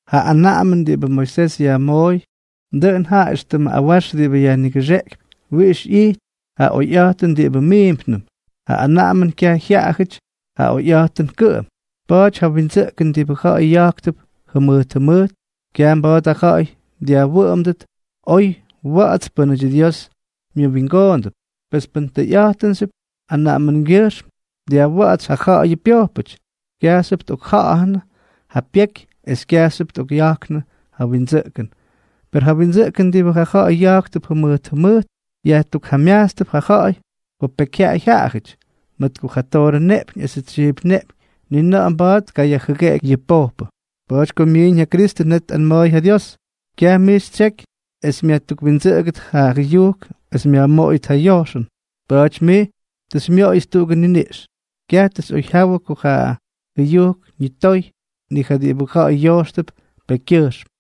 Ja anaꞌamʉn diꞌibʉ Moisés yajmooy, dʉꞌʉn jaꞌa éxtʉmʉ awax diꞌibʉ yajnigʉxeꞌkypy wiꞌix ꞌyity ja oyꞌa̱jtʉn diꞌibʉ miimpnʉm, ja anaꞌamʉn kyaj jyaꞌajʉty ja oyꞌa̱jtʉn kʉꞌʉm. Pa̱a̱ty ja windsʉꞌkʉn diꞌibʉ ja̱ꞌa̱y ya̱jktʉp jʉmʉjt jʉmʉjt, kyaj mba̱a̱t ja ja̱ꞌa̱y dyajwʉꞌʉmdʉt oy wa̱ꞌa̱ts pʉ́nʉty Dios myʉwingoondʉp. Pes pʉn tʉyꞌa̱jtʉnxyʉp anaꞌamʉngyʉjxm dyajwa̱ꞌa̱tsy ja ja̱ꞌa̱yʉ pyojpʉty, kyajxyʉp tꞌokja̱ꞌa̱nʉ ja pyeky es kyajxyʉp tꞌokꞌya̱jknʉ ja windsʉꞌkʉn. Per ja windsʉꞌkʉn diꞌibʉ ja ja̱ꞌa̱y ya̱jktʉp jʉmʉjt jʉmʉjt yajtukjamyajtstʉp ja ja̱ꞌa̱y ko pekyjyaꞌay jaꞌajʉty, mʉt ko ja toorʉ neꞌpyñ esʉ tsyiip neꞌpyñ ni na̱ꞌa̱ mba̱a̱t tkayajjʉgeꞌeky yʉ pojpʉ. Pa̱a̱ty ko myiiñ ja Kristʉ, net tꞌama̱a̱y ja Dios: Kyaj mij xytsyejky es myajtukwindsʉꞌʉgʉt ja jʉyujk esʉ myajmoꞌoyʉt ja yojxʉn, pa̱a̱ty mij tʉ xymyoꞌoyʉts tuꞌugʉ niniꞌx. Kyaj tʉ xyꞌoyjyawʉ ko ja jʉyujk ñitoy, ni ja diꞌibʉ ja̱ꞌa̱y yojxtʉp pekykyʉjxm.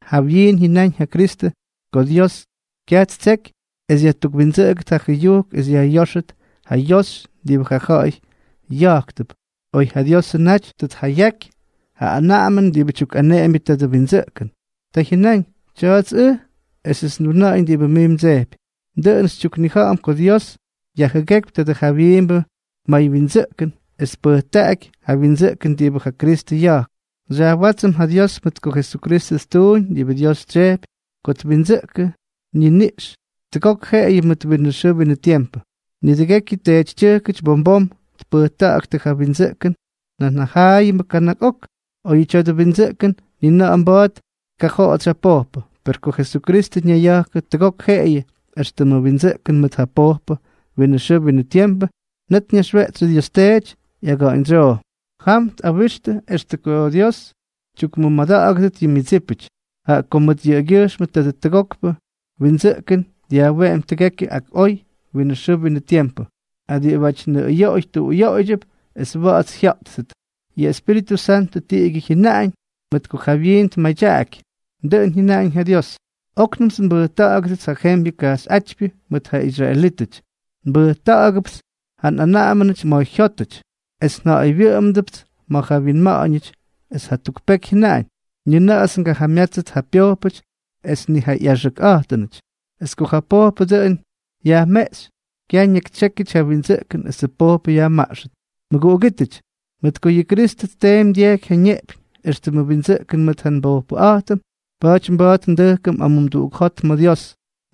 Jawyiin jyʉnáñ ja Kristʉ ko Dios kyaj ttseky es yajtukwindsʉꞌʉgʉt ja jʉyujk es yajtóyʉt ja yoxy diꞌibʉ ja ja̱ꞌa̱y ya̱jktʉp, oy ja Diosʉ naty tʉ tjayaky ja anaꞌamʉn diꞌibʉ tyukꞌaneꞌembyʉ tadʉ windsʉꞌkʉn. Ta jyʉnáñ: “Tya̱a̱ts ʉj, esʉts nduna̱ꞌa̱ñ diꞌibʉ mij mdsejpy.” Dʉꞌʉn xytyuknija̱ꞌa̱m ko Dios yajjʉgékypy tadʉ jawyiimbʉ maywyindsʉꞌkʉn es tpʉjktaꞌaky ja windsʉꞌkʉn diꞌibʉ ja Kristʉ ya̱jk. Xyajwátsʉm ja Dios mʉt ko Jesukristʉ ttuuñ diꞌibʉ Dios tsyejpy ko ttukwindsʉꞌkʉ ñiniꞌx tʉgok jeꞌeyʉ mʉt winʉ xʉʉ winʉ tiempʉ. Nidʉgekyʉ teetytyʉjkʉty bom bom tpʉjta̱ꞌa̱ktʉ ja windsʉꞌkʉn nan jaꞌayʉmbʉ kana̱k ok, oyʉ tya̱dʉ windsʉꞌkʉn ni na̱ꞌa̱ mba̱a̱t tkajoꞌotsy ja pojpʉ. Per ko Jesukristʉ ñayya̱jkʉ tʉgok jeꞌeyʉ éxtʉmʉ windsʉꞌkʉn mʉt ja pojpʉ winʉ xʉʉ winʉ tiempʉ, net ñaxweꞌtsy Dios Teety ꞌyaga̱ꞌa̱ñdsyoo. Jam tꞌawixy extʉ ko Dios tyukmʉmada̱ꞌa̱gʉdʉt yʉ myʉdsípʉty, jaꞌa ko mʉt yʉꞌʉgyʉjxmʉ tadʉ tʉgokpʉ windsʉꞌkʉn dyajweꞌemy tʉgekyʉ ak oy winʉ xʉʉ winʉ tiempʉ ja diꞌibáty nʉꞌʉyoꞌoy tuꞌuyoꞌoydyʉp es wa̱ꞌa̱ts jya̱ꞌttʉt. Yʉ Espíritʉ Santʉ tiꞌigyʉ jyʉnaꞌañ, mʉt ko jawyiin tmadyaꞌaky: Dʉꞌʉn jyʉnaꞌañ ja Dios: Oknʉmts nbʉjta̱ꞌa̱gʉdʉts ja jembyʉ kajxyꞌátypyʉ mʉt ja israelítʉty. Nbʉjta̱ꞌa̱gʉpts yʉ nꞌanaꞌamʉnʉty ma̱ jyótʉty, es nja̱a̱ywyʉꞌʉmʉdʉts ma̱ ja wyinma̱ꞌa̱ñʉty. Es jatuk peky jyʉnaꞌañ: Nina̱ꞌa̱ts ngajamyátsʉt ja pyojpʉty es ni ja ꞌyaxʉkꞌa̱jtʉnʉty. Es ko ja pojpʉ dʉꞌʉn yajmeꞌxy, kyaj ñakytsyékyʉty ja windsʉꞌkʉn esʉ pojpʉ yajmaꞌxʉt. Mʉguꞌugítʉty, mʉt ko yʉ Kristʉ tteemy dyejky ja ñeꞌpyñ éxtʉmʉ windsʉꞌkʉn mʉt ja nbojpʉꞌa̱jtʉm, pa̱a̱ty mba̱a̱t ndʉjkʉm amumduꞌuk jot ma̱ Dios,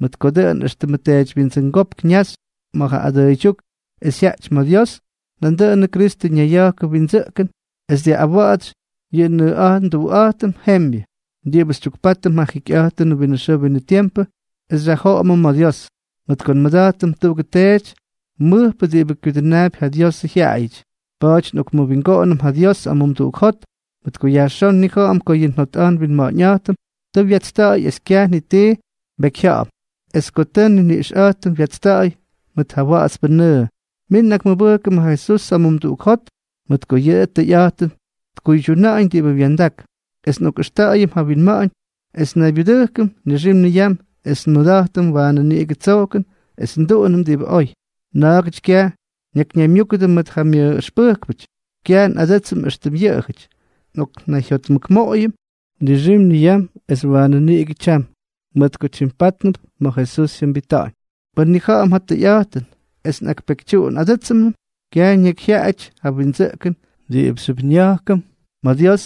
mʉt ko dʉꞌʉn éxtʉmʉ teedywyindsʉngópk ñajxy ma̱ ja adʉʉydyúk es jyaꞌty ma̱ Dios, nandʉꞌʉnʉ Kristʉ ñayya̱jkʉ windsʉꞌkʉn es dyaꞌꞌawatsy yʉ nnʉꞌa̱jt nduꞌa̱jtʉm jembyʉ, diꞌibʉ xytyukpátʉm ja jikyꞌa̱jtʉn winʉ xʉʉ winʉ tiempʉ es xyajjoꞌomʉm ma̱ Dios. Mʉt ko nmʉda̱jtʉm tuꞌugʉ teety mʉjpʉ diꞌibʉ kyudʉnaapy ja Diosʉ jyaꞌayʉty, pa̱a̱ty nꞌokmʉwingoꞌonʉm ja Dios amumduꞌuk jot, mʉt ko yajxón nnija̱ꞌa̱m ko yʉ njotꞌa̱jt nwinma̱ꞌa̱ñꞌa̱jtʉm tʉ wyatsta̱ꞌa̱y es kyaj ti nbekyjya̱ꞌa̱m, es ko tʉ yʉ nniniꞌxꞌa̱jtʉm wyatsta̱ꞌa̱y mʉt ja wa̱ꞌa̱tspʉ nʉʉ. Min nꞌakmʉbʉjkʉm ja Jesús amumduꞌuk jot, mʉt ko yʉꞌʉ tʉyꞌa̱jtʉn tkuydyuna̱ꞌa̱ñ diꞌibʉ wya̱ndak, es nꞌokꞌʉxta̱ꞌa̱yʉm ja winma̱ꞌa̱ñ es nnaybyudʉjkʉm nixim niyam es nmʉda̱jtʉm waanʉ niꞌigʉ tsojkʉn es nduꞌunʉm diꞌibʉ oy. Na̱a̱gʉty kyaj ñakyñaymyúkʉdʉ mʉt ja myʉꞌꞌʉxpʉjkpʉty. Kyaj nꞌadsʉ́tsʉm éxtʉm yʉꞌʉjʉty, nꞌoknayjyotmʉkmoꞌoyʉm nixim niyam, es waanʉ niꞌigʉ tyam, mʉt ko tyimpátnʉp ma̱ Jesús jyʉmbita̱ꞌa̱ñ. Pʉn njanija̱ꞌa̱m ja tʉyꞌa̱jtʉn es nꞌakpekytyuunꞌadʉ́tsʉm, kyaj ñakyjyaaty ja windsʉꞌkʉn diꞌibʉxyʉp nya̱jkʉm ma̱ Dios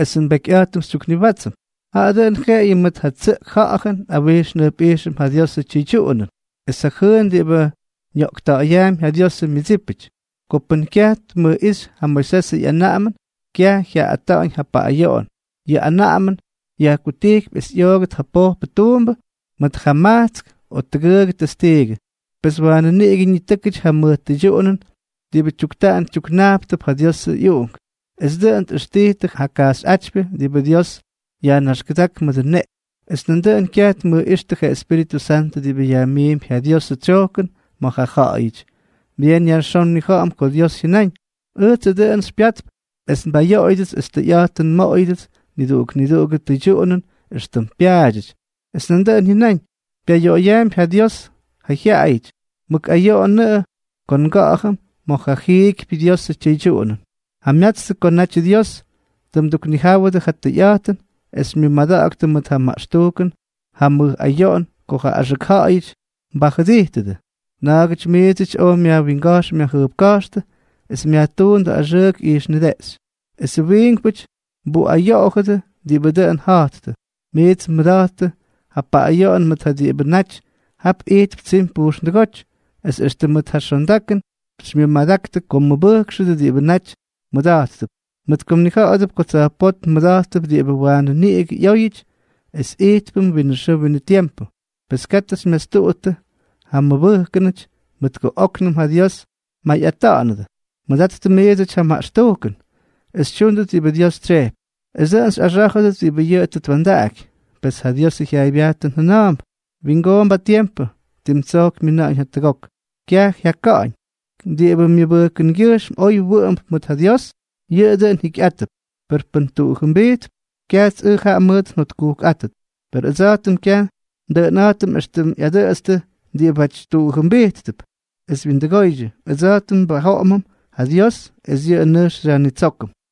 es ja nbekyꞌa̱jtʉm xytyukniwátsʉm, jaꞌa dʉn jeꞌeyʉ mʉt ja tsʉꞌk ja̱ꞌa̱jʉn nꞌawijx njʉjpꞌijxʉm ja Diosʉ tyʉydyuꞌunʉn es ja jʉʉn diꞌibʉ ñoꞌkta̱ꞌa̱yaampy ja Diosʉ myʉdsípʉty. Ko pʉ́n kyaj tmʉjꞌíxy ja Moisesʉ ꞌyanaꞌamʉn, kyaj jyaaꞌꞌata̱ꞌa̱ñ ja paꞌꞌayoꞌon, yʉ anaꞌamʉn yajkutijkypy es ꞌyoogʉt ja pojpʉ tuumbʉ pʉn jaa majtsk o tʉgʉʉgʉ testiigʉ. Pes waanʉ niꞌigʉ ñitʉ́kʉty ja mʉj tʉydyuꞌunʉn diꞌibʉ tyuktaꞌan tyuknajptʉp ja Diosʉ ꞌyUꞌunk, es dʉꞌʉn tꞌʉxtijtʉ ja kajxyꞌátypyʉ diꞌibʉ Dios yajnaxkʉdák mʉdʉ neꞌpyñ, es nandʉꞌʉn kyaj tmʉjꞌíxtʉ ja Espíritʉ Santʉ diꞌibʉ yajmiimpy ja Diosʉ tsyojkʉn ma̱ ja ja̱ꞌa̱yʉty. Byeen yajxón nnija̱ꞌa̱m ko Dios jyʉnáñ: “Ʉjtsʉ dʉꞌʉn xypyatp es nbayoꞌoyʉdʉts, es tʉyꞌa̱jtʉn nmoꞌoyʉdʉts niduꞌuk niduꞌugʉ tʉydyuꞌunʉn éxtʉm pyaadyʉty.” Es nandʉꞌʉn jyʉnáñ: “Pyayoꞌoyaampy ja Dios ja jyaꞌayʉty.” Mʉk ayoꞌonʉꞌʉ ko nga̱ꞌa̱jʉm ma̱ ja jiikypyʉ Diosʉ tyʉydyuꞌunʉn. Jamyatstʉ ko natyʉ Dios tʉ mduknijáwʉdʉ ja tʉyꞌa̱jtʉn es xymyʉmadaktʉ mʉt ja maꞌxtujkʉn ja mʉj ayoꞌon ko ja axʉk ja̱ꞌa̱yʉty mbajʉdijtʉdʉ. Na̱a̱gʉty miidsʉty oj myajwinga̱jx myajjʉjpka̱jxtʉ es myajtúndʉ axʉʉk ijxnideꞌxy, esʉ wiinkpʉty mbuꞌayoꞌojʉdʉ diꞌibʉ dʉꞌʉn ja̱jttʉ. Miits mmʉda̱jttʉ ja paꞌꞌayoꞌon mʉt ja diꞌibʉ naty jap ijtp tsimy pujxndʉgóty, es extʉ mʉt ja xondakʉn xymyʉmadaktʉ ko mbʉjkxʉdʉ diꞌibʉ naty mmʉda̱jttʉp, mʉt ko mnija̱ꞌa̱dʉp ko tsa̱jpótm mmʉda̱jttʉp diꞌibʉ waanʉ niꞌigʉ ꞌyóyʉty es ijtpʉm winʉ xʉʉ winʉ tiempʉ. Pes, katʉ xymyastuꞌuttʉt ja mmʉbʉjkʉnʉty, mʉt ko óknʉm ja Dios mmayꞌata̱ꞌa̱nʉdʉ. Mʉdattʉ miidsʉty ja maꞌxtujkʉn es xytyúndʉt diꞌibʉ Dios tsyejpy, es dʉꞌʉn xyꞌaxá̱jʉdʉt diꞌibʉ yʉꞌʉ tʉ twa̱ndaꞌaky. Pes ja Diosʉ jyaaybyajtʉn jʉna̱a̱mp: Wingoomp ja tiempʉ, tim tsojk myina̱ꞌa̱ñ jatʉgok. Kyaj jyaka̱ꞌa̱ñ. Diꞌibʉ myʉbʉjkʉngyʉjxm oy wʉꞌʉmp mʉt ja Dios, yʉꞌʉ dʉꞌʉn jikyꞌátʉp; per pʉ́n tuꞌujʉbijtp, kyajts ʉj jaꞌa mʉʉt njotkujkꞌátʉt. Per ʉdsa̱jtʉm kyaj ndʉꞌʉnꞌa̱jtʉm éxtʉm ꞌyadʉꞌʉtstʉ diꞌibáty tuꞌujʉmbijttʉp es wyindʉgoydyʉ, ʉdsa̱jtʉm nbajoꞌomʉm ja Dios, es yʉꞌʉ nʉjx xyajnitsókʉm.